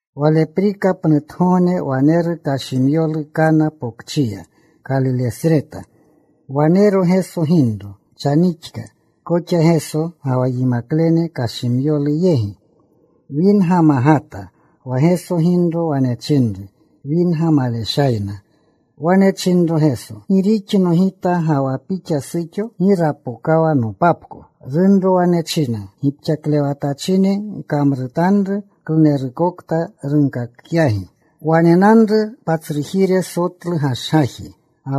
Waleprika pnutgogne waneru kashimyolu Kana Pokchiya, Kalilesreta. Wanero Geso ginro. Chanixka koxa Geso ga wa yimaklene kashimyolu yegi. Winga magata. Wa Geso ginro wane chinru, “Winga maleshayna.” Wane chinro Geso, “¿Gi rixno Gita ga wa pixa, suxo? Gi rapokawa nopapko.” Runro wane chinna gipxaklewatachine, “Gkamrutanru klunerukokta runkakyagi.” Wanenanru patsrujire sotlu gashgaji,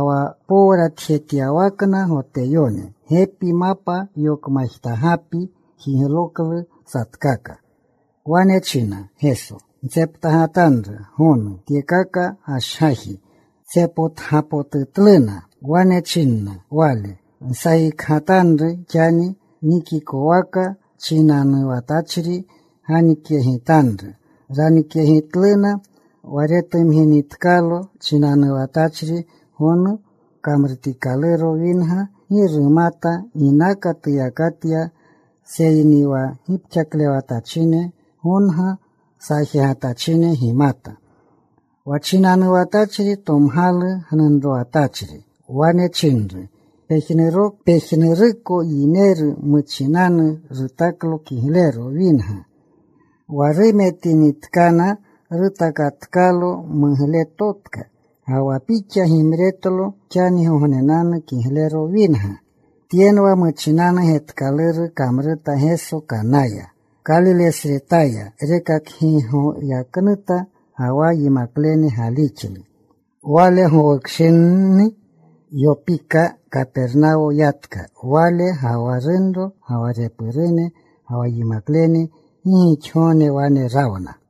wa powratjetyawakna Goteyone. Gepi, mapa yokmajtagapi jigloklu satkaka. Wane chinna Geso, “Ntseptagatanru gonu tyekaka gashgaji.” Tsepotgapotutluna. Wane chinna Wale, “Nsajikgatanru xani. Nikikwaka chinanuwatyachri ganikyegitanru.” Ranikyegitluna. Wa retumginitkalo chinanuwatachri gonu kamrutikaluro winga, gi rumata ginaka tuyakatya, seyni wa gipxaklewatachine gonga saajegatachine gimata. Wa chinanuwatachri tomgalu gnunrowatachri. Wane chinru, “Pejnuruko yineru muchinanu rutaklo kiglero winga. Wa rumetinitkana rutakatkalo mugletotka. Ga wa pixa gimretlo xangognenanu kiglero winga.” Tyenwa muchinanu getkaluru kamruta Geso Kanaya, Kalilesretaya. Rekakgigoyaknuta. Ga wa yimaklene galixlu. Wale gowukshini yopika. Kapernawo yatka Wale ga wa runro, ga wa repurune, ga wa yimaklene. Gi gixgogne wane rawna.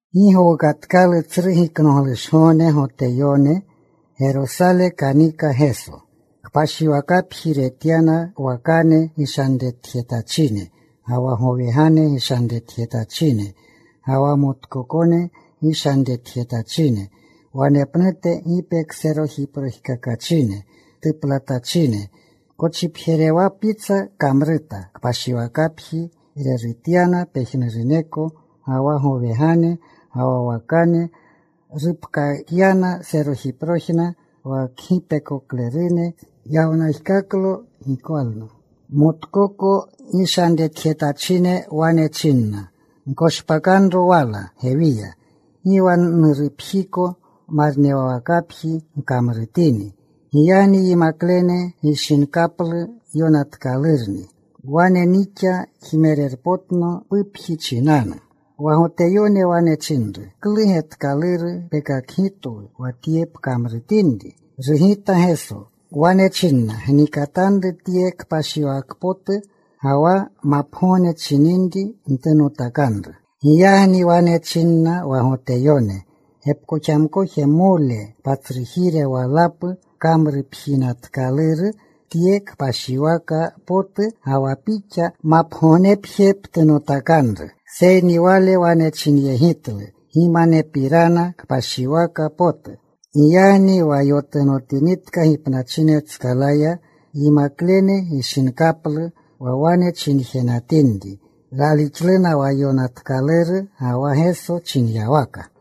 Gi gowukatkalu Tsru Giknoglushgogne Goteyonenu. Gerosale kanika Geso. Kpashiwakapji retyana wakane gishanretjetachine, ga wa gowegane gishanretjetachine, ga wa motkokone gishanretjetachine, wanepnute gipekserojiprojkakachine tuplatachine. Kochipjerewapitsa kamruta. Kpashiwakapji rerutyana pejnuruneko, ga wa gowegane, ga wa wakane. Rupkakyanna serojiprojna wa kgipekoklerune. Yawnajkaklo gikwalna. Motkoko gishanretjetachine wane china, “Gkoshpakanro wala gewiya. Gi wa Nurupjiko marnewakapji gkamrutini.” Giyagni yimaklene gishinkaplu yonatkalurni: Wane nixa jmerpotno pupji chinanu. Wa Goteyone wane chinru, “¿Klu getkaluru pekakgitwu wa tye pkamrutinri?” Rugita Geso. Wane chinna, “Gnikatanru tye kpashiwaka potu, ga wa mapgogne chininri ntunotakanru.” Giyagni wane chinna wa Goteyone, “Gepkoxamkojmole patsrujire walapu kamrupjinatkaluru tye kpashiwaka potu, ga wa Pixa ¿mapgognepje ptunotakanru?” Seyni Wale wane chinyegitlu gimanepirana kpashiwaka potu. Giyagni wa yotunotinitka gipnachinetskalaya, yimaklene gishinkaplu wa wane chinjenatinri. Ralixluna wa yonatkaluru, ga wa Geso chinyawaka.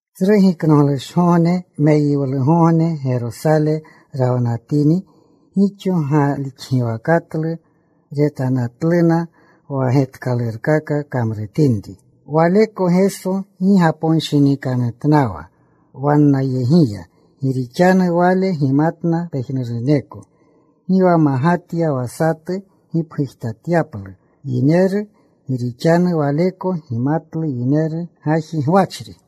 Tsru Giknoglushgogne, meyiwlugogne, Gerosale rawanatini gixo galixgiwakatlu. Retanatluna wa getkalurkaka kamrutini. Waleko Geso gi gaponshinikanyegitnawa wannayegiya, gi rixanu Wale gimatna pejnuruneko. Gi wa magatya wa satu gipgujtatyaplu yineru, gi rixanu Waleko gimatlu yineru gaji gwachri.